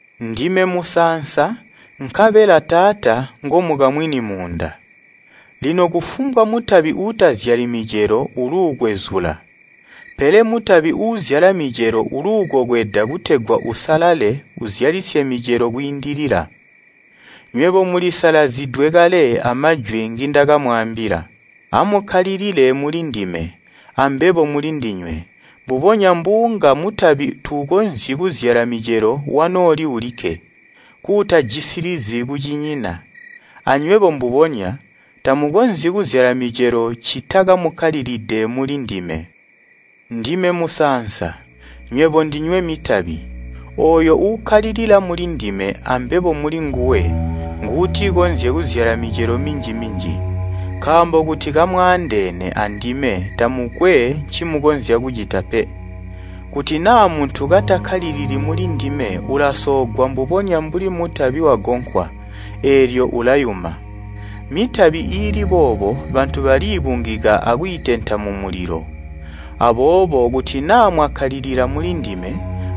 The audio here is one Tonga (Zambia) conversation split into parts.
“Ndime musaansa nkabela Taata ngomukamwini muunda. Lino kufumbwa mutabi uutazyali micelo uluukwezula, pele mutabi uuzyala micelo uluukokweda kutegwa usalale uzyalisye micelo kwiindilila. Nywebo mulisalazidwe kale amajwi ngindakamwaambila. Amukkalilile mulindime, ambebo mulindinywe. Mbubonya mbuunga mutabi tuukonzyi kuzyala micelo wanooli ulikke, kuutajisilizi kucinyina, anywebo mbubonya, tamukonzyi kuzyala micelo ccita kamukkalilide mulindime. Ndime musaansa, nywebo ndinywe mitabi. Ooyo uukkalilila mulindime ambebo mulinguwe, nguutikonzye kuzyala micelo minji-minji, nkaambo kuti kamwaandeene andime tamukwe ncimukonzya kucita pe. Kuti naa muntu katakkalilili mulindime ulasoogwa mbubonya mbuli mutabi wagonkwa, eelyo ulayuma. Mitabi iili boobo bantu baliibungika akwiitenta mumulilo. Aboobo kuti naa mwakkalilila mulindime,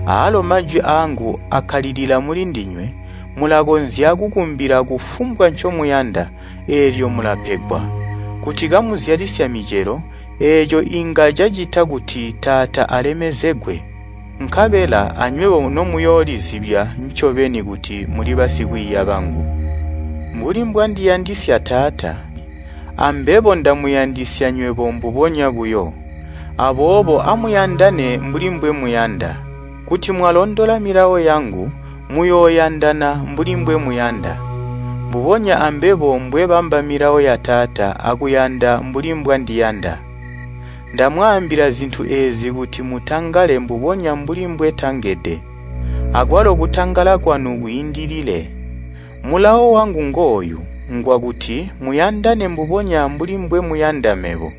aalo majwi aangu akkalilila mulindinywe, mulakonzya kukumbila kufumbwa ncomuyanda, eelyo mulapegwa. Kuti kamuzyalisya micelo, eeco inga cacita kuti Taata alemezegwe, nkabela anywebo nomuyoolizibya ncobeni kuti muli basikwiiya bangu. “Mbuli mbwandiyandisya Taata, ambebo ndamuyandisya nywebo mbubonya buyo. Aboobo amuyandane mbuli mbwemuyanda. Kuti mwalondola milawo yangu, muyooyandana mbuli mbwemuyanda, mbubonya ambebo mbwebamba milawo ya Taata akuyanda mbuli mbwandiyanda. Ndamwaambila zintu eezi kuti mutangale mbubonya mbuli mbwetangede, akwalo kutangala kwanu kwiindilile. Mulawo wangu ngooyu, ngwakuti muyandane mbubonya mbuli mbwemuyanda mebo.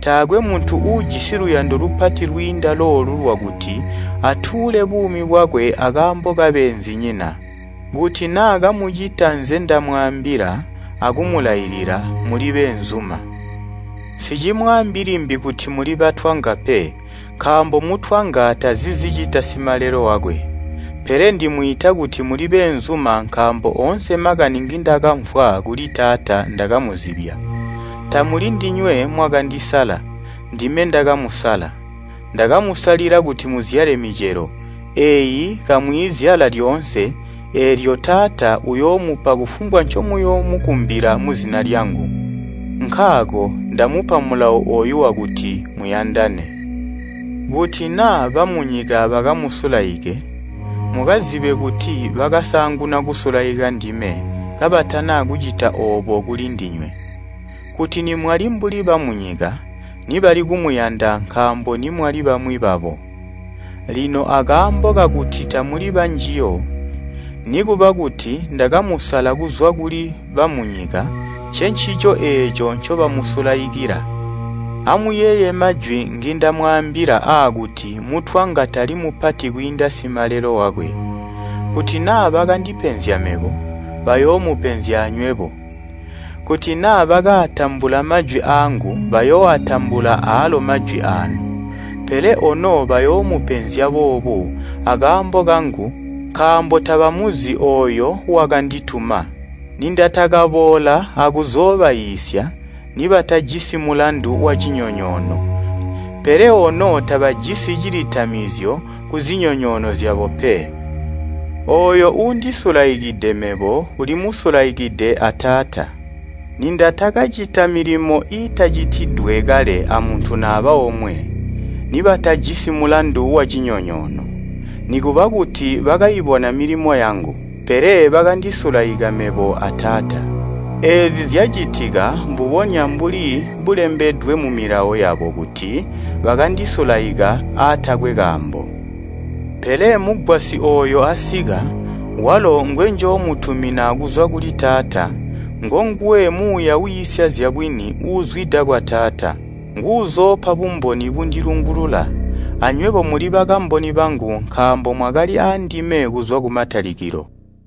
Taakwe muntu uujisi luyando lupati lwiinda loolu lwakuti atuule buumi bwakwe akaambo kabeenzinyina. Kuti naa kamucita nzendamwaambila akumulailila mulibeenzuma. Nsicimwaambi limbi kuti muli batwanga pe, nkaambo mutwanga tazi zicita simalelo wakwe, pele ndimwiita kuti muli beenzuma nkaambo oonse makani ngindakamvwa kuli Taata ndakamuzibya. Tamuli ndinywe mwakandisala, ndime ndakamusala. Ndakamusalila kuti muzyale micelo, eyi kamwiizyala lyoonse, eelyo Taata uyoomupa kufumbwa ncomuyoomukumbila muzina lyangu. Nkaako ndamupa mulawo ooyu wakuti muyandane. “Kuti naa bamunyika bakamusulaike, mukazibe kuti bakasaanguna kusulaika ndime kabatana kucita oobo kuli ndinywe. Kuti nimwali mbuli bamunyika, nibali kumuyanda nkaambo nimwali bamwi babo. Lino akaambo kakuti tamuli banjiyo, nikuba kuti ndakamusala kuzwa kuli bamunyika, ncencico eeco ncobamusulaikila. Amuyeeye majwi ngindamwaambila aakuti ‘Mutwanga tali mupati kwiinda simalelo wakwe!’ Kuti naa bakandipenzya mebo, bayoomupenzya anywebo. Kuti naa bakaatambula majwi aangu bayooatambula aalo majwi aanu. Pele ono bayoomupenzya boobu akaambo kangu nkaambo tabamuzi ooyo wakandituma. Nindatakaboola akuzoobaiisya, nibatajisi mulandu wacinyonyoono, pele ono tabajisi cilitamizyo kuzinyonyoono zyabo pe. Ooyo uundisulaikide mebo ulimusulaikide a Taata. Nindatakacita milimo iitanacitidwe kale amuntu naba omwe, nibatajisi mulandu wacinyonyoono. Nikuba kuti bakaibona milimo yangu, pele bakandisulaika mebo a Taata. Eezi zyacitika mbubonya mbuli bulembedwe mu Milawo yabo kuti, ‘Bakandisulaika aatakwe kaambo!’ Pele Mugwasyi ooyo asika, walo ngwenjoomutumina kuzwa kuli Taata, ngonguwe Muuya wiisya zyabwini uuzwida kwa Taata. Nguuzoopa bumboni bundilungulula. Anywebo muli bakamboni bangu nkaambo mwakali aandime kuzwa kumatalikilo.